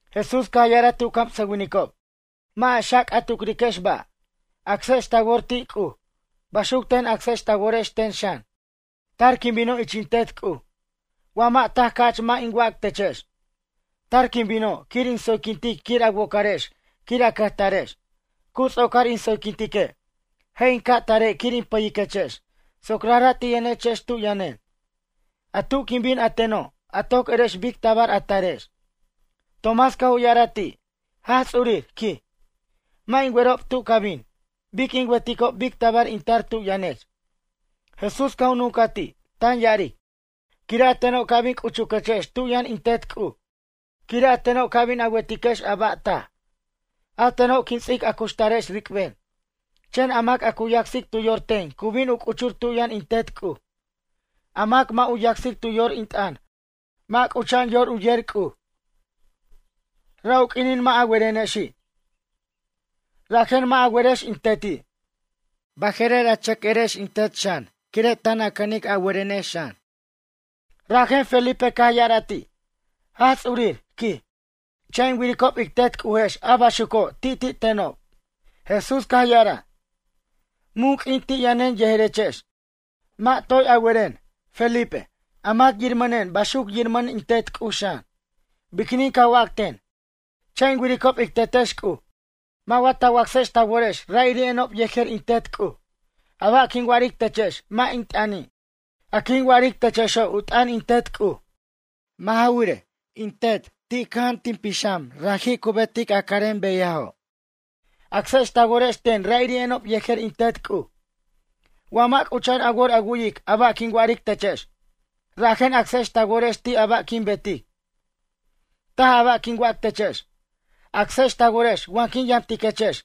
Jesús caj ya'araj ti' u camsʌwinicob: ―Mʌ' a xac' a tucriquex ba', acsex ta wor ti' C'uj. Baxuc ten acsex ta worex ten xan. Tar quin bino' ich in Tet C'uj. Wa mʌ' taj ca'ch mʌ' in wac techex. Tar quin bino' quir in tsoyquintic quir a wocarex quir a cʌjtarex. Cu ts'ocar in tsoyquintique', je' in ca' tare' quir in pʌyiquechex soc rajra' ti' yʌnechex tu' yʌnen. A tu' quin bin a teno' a toc erex bic tabar a tarex. Tomás caj u ya'araj ti': ―Jaj Ts'urir ―quij―, mʌ' in werob tu' ca bin. Bic in weticob bic tabar in tar tu' yʌnech? Jesús caj u nuncaj ti', tan ya'aric: ―Quire' a teno' ca' bin c'uchuquechex tu' yʌn in Tet C'uj. Quire' a teno' ca' bin a wetiquex a ba' taj. A teno' quin ts'ic a cuxtarex ric'ben. Chen a mac a cu yacsic tu yor ten cu bin u c'uchur tu' yʌn in Tet C'uj. A mac mʌ' u yacsic tu yor in t'ʌn mʌ' c'ucha'an yor u yer C'uj. Ra' u q'uinin mʌ' a werenexi', rajen mʌ' a werex in Teti'. Baje'rer a chʌc erex in Tet xan quire' tan a cʌnic a werenex xan. Rajen Felipe caj ya'araj ti': ―Jaj Ts'urir ―quij―, cha' in wiricob ic Tet C'ujex a baxuco' ti'ti' tenob. Jesús caj ya'araj: ―Mun q'uin ti' yʌnen yejerechex? Mʌ' toy a weren, Felipe? A mac yirmʌnen baxuc yirmʌn in Tet C'uj xan. Biquinin ca wac ten: “Cha' in wiricob ic Tetex C'uj”? Mʌ' wa ta wacsex ta worex ra'iri'enob yejer in Tet C'uj? A ba' quin wa'aric techex mʌ' in t'ʌni'. A quin wa'aric techexo' u t'ʌn in Tet C'uj. Mʌ' ja wirej, in Tet ti' cʌja'an tin pixam raji' cu betic a carem beyajo'. Acsex ta worex ten ra'iri'enob yejer in Tet C'uj. Wa mʌ' c'ucha'an a wor a wu'yic a ba' quin wa'aric techex, rajen acsex ta worex ti' a ba' quin betic. Taj a ba' quin wac techex. Acsex ta worex wa quin yamtiquechex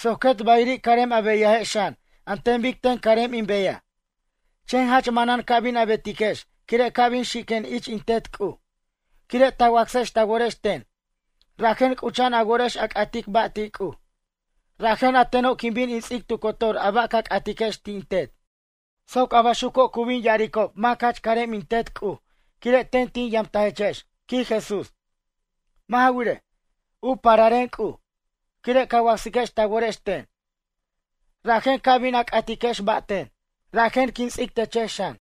soc quet bayiri' carem a beyajex xan an ten bic ten carem in beyaj. Chen jach manan ca bin a betiquex quire' ca' bin xiquen ich in Tet C'uj. Quire' ta wacsex ta worex ten, rajen c'ucha'an a worex a c'atic ba' ti' C'uj. Rajen a teno' quin bin in ts'ic tu cotor a ba' ca c'atiquex ti' in Tet. Soc a baxuco' cu bin ya'aricob mac jach carem in Tet C'uj quire' ten tin yamtajechex ―quij Jesús―. Mʌ' ja wirej, u pararen C'uj. Quire' ca wacsiquex ta worex ten, rajen ca bin a c'atiquex ba' ten, rajen quin ts'ic techex xan.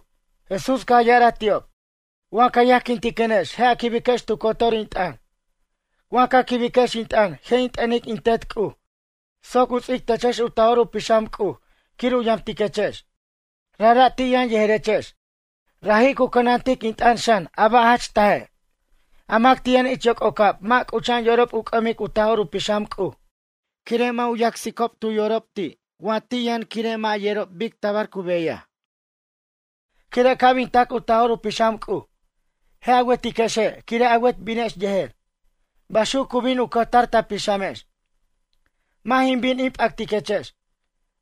Jesús caj ya'araj ti'ob: ―Wa ca yajquintiquenex je' a quibiquex tu cotor in t'ʌn. Wa ca quibiquex in t'ʌn je' in t'ʌnic in Tet C'uj soc u ts'ic techex u Taj'or u Pixam C'uj quir u yamtiquechex. Rajra' ti' yʌn yejerechex. Raji' cu cʌnantic in t'ʌn xan a ba' jach taje'. A mac ti' yʌn ich yoc'ocab mʌ' c'uch'a'an yorob u c'ʌmic u Taj'or u Pixam C'uj quire' mʌ' u yacsicob tu yorob ti' wa ti' yʌn quire' mʌ' yerob bic tabar cu beyaj. Quire' ca' bin tac u Taj'or u Pixam C'uj, je' a wetiquexe' quire' a wet binex yejer. Baxuc cu bin u cʌjtar ta pixamex. Mʌ' jin bin in p'ʌtiquechex,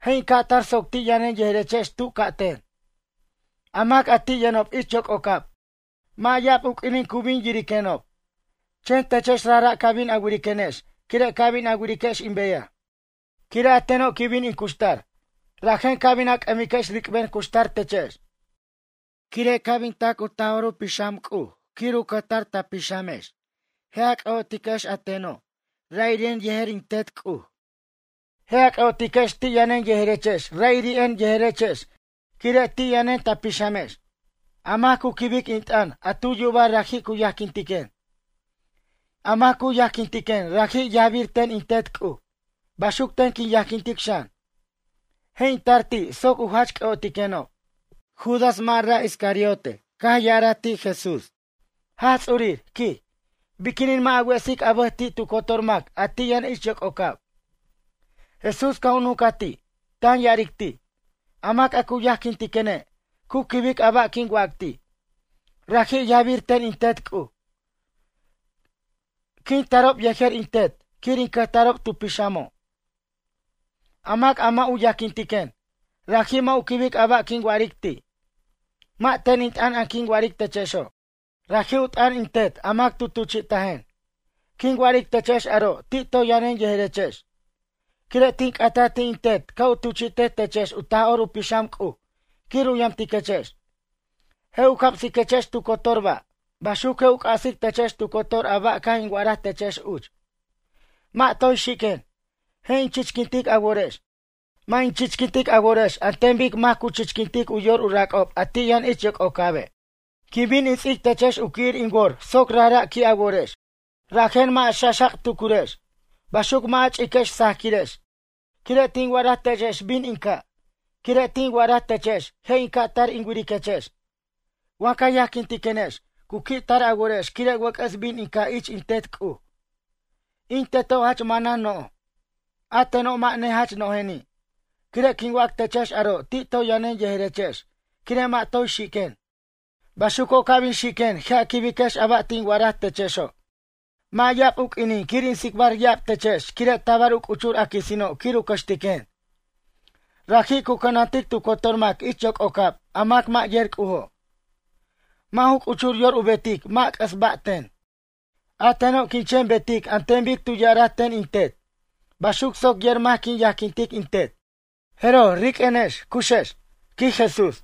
je' in ca' tar soc ti' yʌnen yejerechex tu ca' ten. A mac a ti' yʌnob ich yoc'ocab, mʌ' ya'ab u q'uinin cu bin yiriquenob. Chen techex rajra' ca bin a wiriquenex quire' ca bin a wiriquex in beyaj. Quire' a teno' quin bin in cuxtar, rajen ca bin a c'ʌmiquex ric'ben cuxtar techex. Quire' ca' bin tac u Taj'or u Pixam C'uj quir u cʌjtar ta pixamex je' a c'ʌ'otiquex a teno' ra'iri'en yejer in Tet C'uj. Je' a c'ʌ'otiquex ti' yʌnen yejerechex ra'iri'en yejerechex quire' ti' yʌnen ta pixamex. A mac cu quibic in t'ʌn a tu yubaj raji' cu yajquintiquen. A mac cu yajquintiquen raji' yajbir ten in Tet C'uj. Baxuc ten quin yajquintic xan. Je' in tar ti' soc u jach c'ʌ'otiquenob. Judas mʌ' ra' Iscariote caj ya'araj ti' Jesús: ―Jaj Ts'urir ―quij―, biquinin mʌ' a wesic a bʌj ti' tu cotor mac a ti' yʌn ich yoc'ocab? Jesús caj u nuncaj ti', tan ya'aric ti': ―A mac a cu yajquintiquene' cu quibic a ba' quin wac ti'. Raji' yajbir ten in Tet C'uj. Quin tarob yejer in Tet quir in cʌjtarob tu pixamo'. A mac a mʌ' u yajquintiquen, raji' mʌ' u quibic a ba' quin wa'aric ti'. Mʌ' ten in t'ʌn a quin wa'aric techexo'. Raji' u t'ʌn in Tet a mac tu tuchi'tajen. ’Quin wa'aric techex aro' ti' toy yʌnen yejerechex. Quire' tin c'ataj ti' in Tet ca' u tuchi'tej techex u Taj'or u Pixam C'uj quir u yamtiquechex. Je' u camsiquechex tu cotor ba'. Baxuc je' u c'asic techex tu cotor a ba' caj in wa'araj techex uch. ’Mʌ' toy xiquen, je' in chichquintic a worex. Mʌ' in chichquintic a worex an ten bic mac cu chichquintic u yor u rac'ob a ti' yʌn ich yoc'ocabe'. Quin bin in ts'ic techex u qui'ir in wor soc rajra' qui' a worex. Rajen mʌ' a xa'xac' tucurex, baxuc mʌ' a ch'iquex sajaquirex. Quire' tin wa'araj techex bin in ca'. Quire' tin wa'araj techex je' in ca' tar in wiriquechex. Wa ca yajquintiquenex cu qui' tar a worex quire' wʌc'ʌs bin in ca' ich in Tet C'uj. In Teto' jach manan no'j, a teno' mʌ' nejach no'jeni'. Quire' quin wac techex aro' ti' toy yʌnen yejerechex quire' mʌ' toy xiquen. Baxuco' ca' bin xiquen je' a quibiquex a ba' tin wa'araj techexo'. ’Mʌ' ya'ab u q'uinin quir in tsicbar ya'ab techex quire' tabar u c'uchur a quisino' quir u cʌxtiquen. Raji' cu cʌnantic tu cotor mac ich yoc'ocab a mac mʌ' yer C'ujo'. Mʌ' ju c'uchur yor u betic mʌ' c'ʌs ba' ten. A teno' quin chen betic an ten bic tu ya'araj ten in Tet. Baxuc soc yer mac quin yajquintic in Tet. Jeroj riq'uenex cuxex ―quij Jesús.